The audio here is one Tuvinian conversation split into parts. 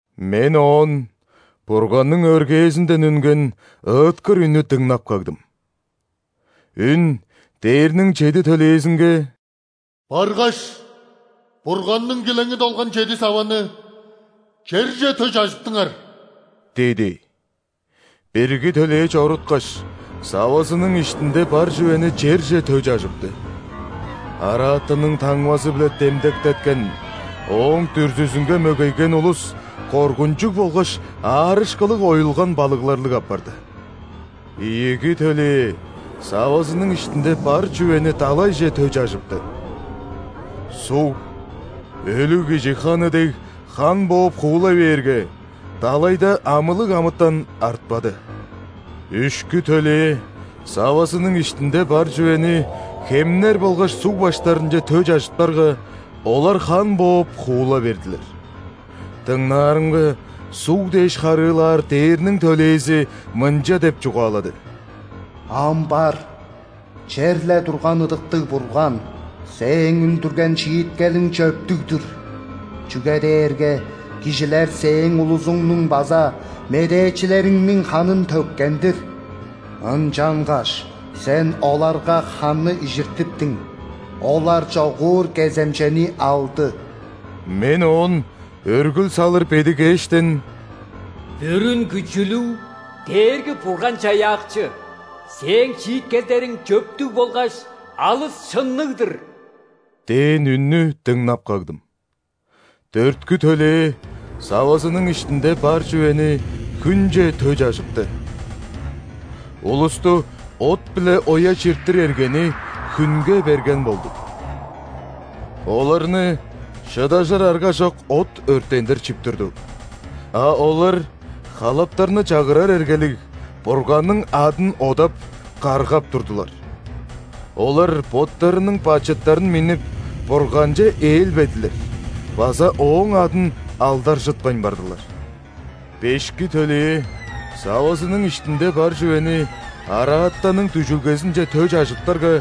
Мен оон Бурганның өргээзинден үнген ыыткыр үннү дыңнап кагдым. Үн дээрниң чеди төлээзинге: «Баргаш, Бурганның килеңи долган чеди саваны черже тө чажыптыңар!» – диди. Бирги төлээ чоруткаш, савазының иштинде бар чүвени черже тө чажыпты. Араатанның таңмазы-биле демдектеткен, ооң дүрзүзүнге мөгейген улус коргунчуг болгаш аарышкылыг оюлган балыгларлыг апарды. Ийиги төлээ савазының иштинде бар чүвени далайже тө чажыпты. Суг өлүг кижи ханы дег хан бооп хуула бээрге, далайда амылыг амытан артпады. Үшкү төлээ савазының иштинде бар чүвени хемнер болгаш суг баштарынче тө чажыптарга, олар хан бооп хуула бердилер. Дыңнаарымга, суг дээш харыылаар ·дээрниң төлээзи мынча деп чугаалады: «Ам бар, черле турган Ыдыктыг Бурган, Сээң үндүрген шииткелиң чөптүг-дүр. Чүге дээрге кижилер Сээң улузуңнуң база медээчилериңниң ханын төккен-дир. Ынчангаш Сен оларга ханны ижиртиптиң. Олар чогуур кеземчени алды». Мен оон өргүл салыр бедигээштен: «Бүрүн Күчүлүг Дээрги-Бурган-Чаяакчы, Сээң шииткелдериң чөптүг болгаш алыс шынныг-дыр!» – дээн үннү дыңнап кагдым. Дөрткү төлээ савазының иштинде бар чүвени хүнче тө чажыпты. Улусту от-биле оя чиртир эргени хүнге берген болду. Оларны шыдажыр аргажок от өрттендир чип турду, а олар халаптарны чагырар эргелиг Бурганның адын одап, каргап турдулар. Олар боттарының бачыттарын миннип, Бурганче ээлбедилер база Ооң адын алдаржытпайн бардылар. Бешки төлээ савазының иштинде бар чүвени араатанның дүжүлгезинче тө чажыптарга,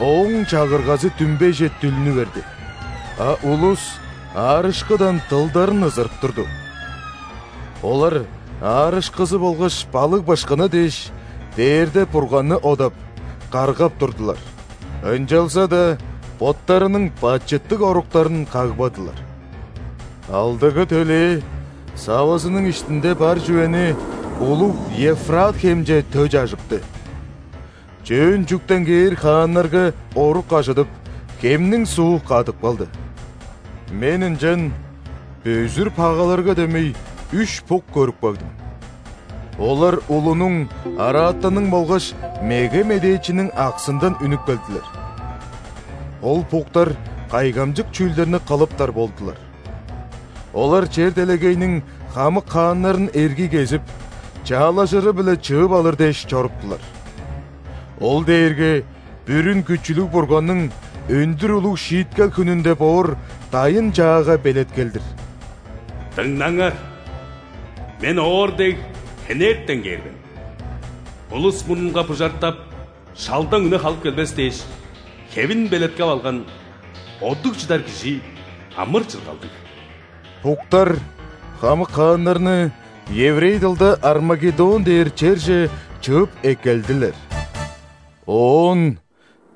ооң чагыргазы дүмбейже дүлнү берди, а улус аарышкыдан дылдарын ызырып турду. Олар аарышкызы болгаш балыг-бышкыны дээш, дээрде Бурганны одап, каргап турдулар, ынчалза-даа боттарының бачыттыг оруктарын кагбадылар. Алдыгы төлээ савазының иштинде бар чүвени улуг Евфрат хемче тө чажыпты. Чөөн чүктен кээр хааннарга орук ажыдып, хемниң суу кадып калды. Мен ынчан бөзүр пагаларга дөмей үш бук көрүп кагдым. Олар улунуң, араатанның болгаш меге медээчиниң аксындан үнүп келдилер. Ол буктар кайгамчык чүүлдерни кылыптар болдулар. Олар чер-делегейниң хамык хааннарын эргий кезип, чаалажыры-биле чыып алыр дээш чоруптулар. Ол дээрге Бүрүн Күчүлүг Бурганның өндүр улуг шииткел хүнүнде боор дайын-чаага белеткел-дир. «Дыңнаңар, Мен, оор дег, хенертен кээр мен. Улус мурнунга бужартап, шалдаң үне халып келбес дээш, хевин белеткеп алган, одуг чыдар кижи амыр-чыргалдыг». Буктар хамык хааннарны еврей дылда Армагеддон дээр черже чыып эккелдилер. Оон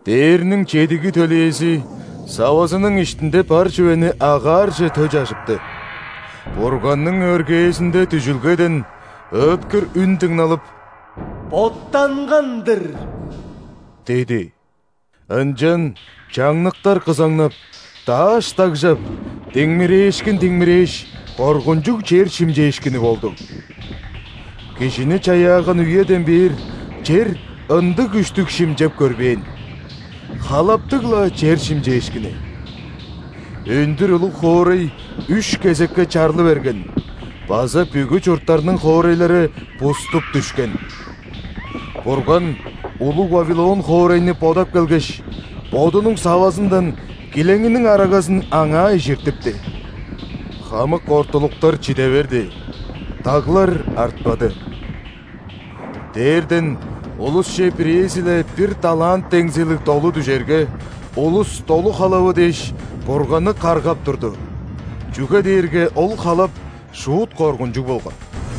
дээрниң чедиги төлээзи савазының иштинде бар чүвени агаарже тө чажыпты. Бурганның өргээзинде дүжүлгеден ыыткыр үн дыңналып: «Боттанган-дыр!» – диди. Ынчан чаңныктар кызаңнап, дааш дагжап, диңмирээшкин диңмирээш, коргунчуг чер шимчээшкини болду. Кижини чаяаган үеден бээр чер ындыг күштүг шимчеп көрбээн! Халаптыг-ла чер шимчээшкини! Өндүр улуг хоорай үш кезекке чарлы берген база бүгү чурттарның хоорайлары буступ дүшкен. Бурган улуг Вавилон хоорайны бодап келгеш, Бодунуң савазындан килеңиниң арагазын аңаа ижиртипти. Хамык ортулуктар чиде берди, даглар артпады. Дээрден улусче бирээзи-ле бир талант деңзилиг долу дүжерге, улус долу халавы дээш, Бурганны каргап турду, чүге дээрге ол халап шуут коргунчуг болган.